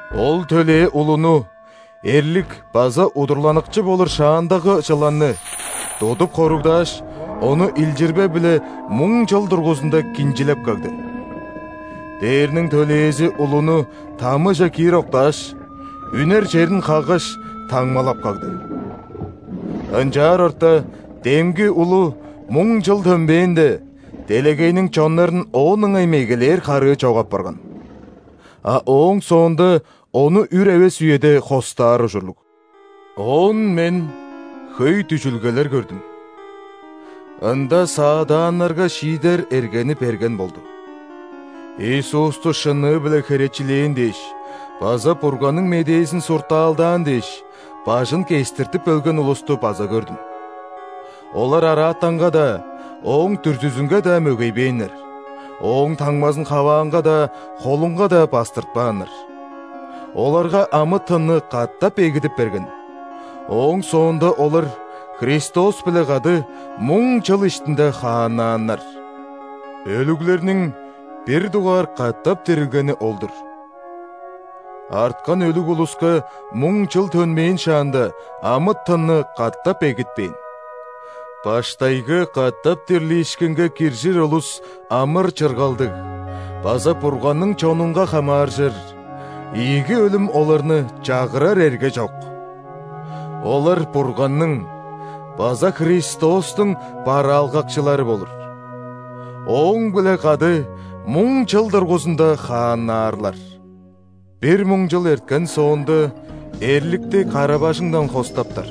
Ол төлээ улуну – эрлик база удурланыкчы болур шаандагы чыланны – тудуп хоругдааш, ону илчирбе-биле муң чыл дургузунда кинчилеп кагды. Дээрниң төлээзи улуну тамыже киир октааш, үнер черин хаггаш, таңмалап кагды. Ынчаар орта демги улу муң чыл төнмээнде, делегейниң чоннарын оон ыңай мегелээр харыы чок апарган. А ооң соонда ону үр эвес үеде хостаар ужурлуг. Оон мен хөй дүжүлгелер көрдүм. Ында саадааннарга шиидер эргени берген болду. Иисусту шынныы-биле херечилээн дээш база Бурганның медээзин суртаалдаан дээш, бажын кестиртип өлген улусту база көрдүм. Олар араатанга-даа, ооң дүрзүзүнге-даа мөгейбээннер, ооң таңмазын хаваанга-даа, холунга-даа бастыртпааннар. Оларга амы-тынны катап эгидип берген, ооң соонда олар Христос-биле кады муң чыл иштинде хааннааннар. Өлүглерниң бир дугаар катап дирилгени ол-дур. Арткан өлүг улуска муң чыл төнмээн шаанда, амы-тынны катап эгитпээн. Баштайгы катап дирлиишкинге киржир улус амыр-чыргалдыг база Бурганның чонунга хамааржыр; ийиги өлүм оларны чагырар эрге чок. Олар Бурганның база Христостуң бараалгакчылары болур, Ооң-биле кады муң чыл дургузунда хааннаарлар. Бир муң чыл эрткен соонда, эрликти кара-бажыңындан хостаптар.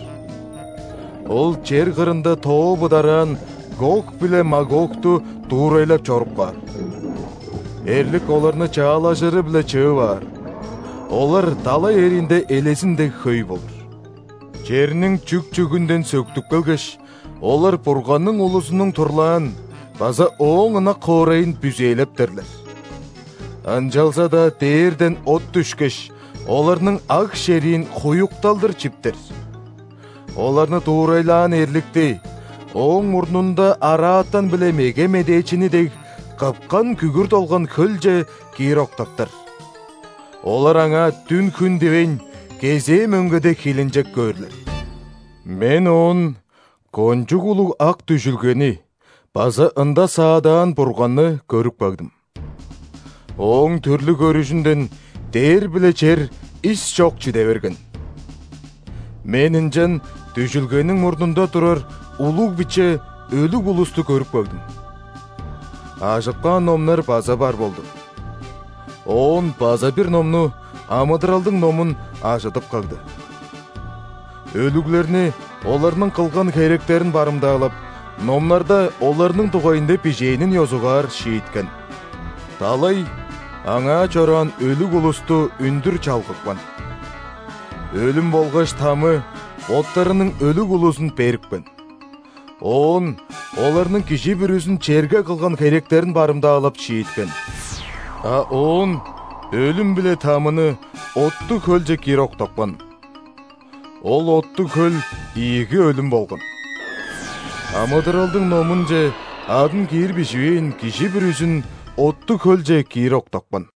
Ол чер кырында тоо быдараан Гог биле Магогту дуурайлап чоруп каар. Эрлик оларны чаалажыры-биле чыып аар, олар далай эриинде элезин дег хөй болур. Черниң чүк-чүгүнден сөктүп келгеш, олар Бурганның улузунуң турлаан база Ооң ынак хоорайын бүзээлептерлер. Ынчалза-даа дээрден от дүшкеш, оларның аг-шериин хуюкталдыр чиптер. Оларны дуурайлаан эрликти, ооң мурнунда араатан биле меге медээчини дег, кыпкан күгүр долган хөлче киир октаптар. Олар аңаа дүн, хүн дивейн, кезээ мөңгеде хилинчек көөрлер. Мен оон кончуг улуг ак дүжүлгени база ында саадаан Бурганны көрүп кагдым. Ооң түрлүг көрүжүнден дээр биле чер ис чок чиде берген. Мен ынчан дүжүлгениң мурнунда турар улуг, биче өлүг улусту көрүп кагдым. Ажып каан номнар база бар болду. Оон база бир номну – амыдыралдың номун – ажыдып кагды. Өлүглерни оларның кылган херектерин барымдаалап, номнарда оларның дугайында бижээнин ёзугаар шииткен. Далай аңаа чораан өлүг улусту үндүр чалгыпкан. Өлүм болгаш Тамы боттарының өлүг улузун берипкен. Оон оларның кижи бүрүзүн черге кылган херектерин барымдаалап шииткен. А оон Өлүм биле ·Тамыны оттуг хөлче киир октапкан. Ол оттуг хөл ийиги өлүм болган. Амыдыралдың номунче адын киир биживээн кижи бүрүзүн оттуг хөлче киир октапкан.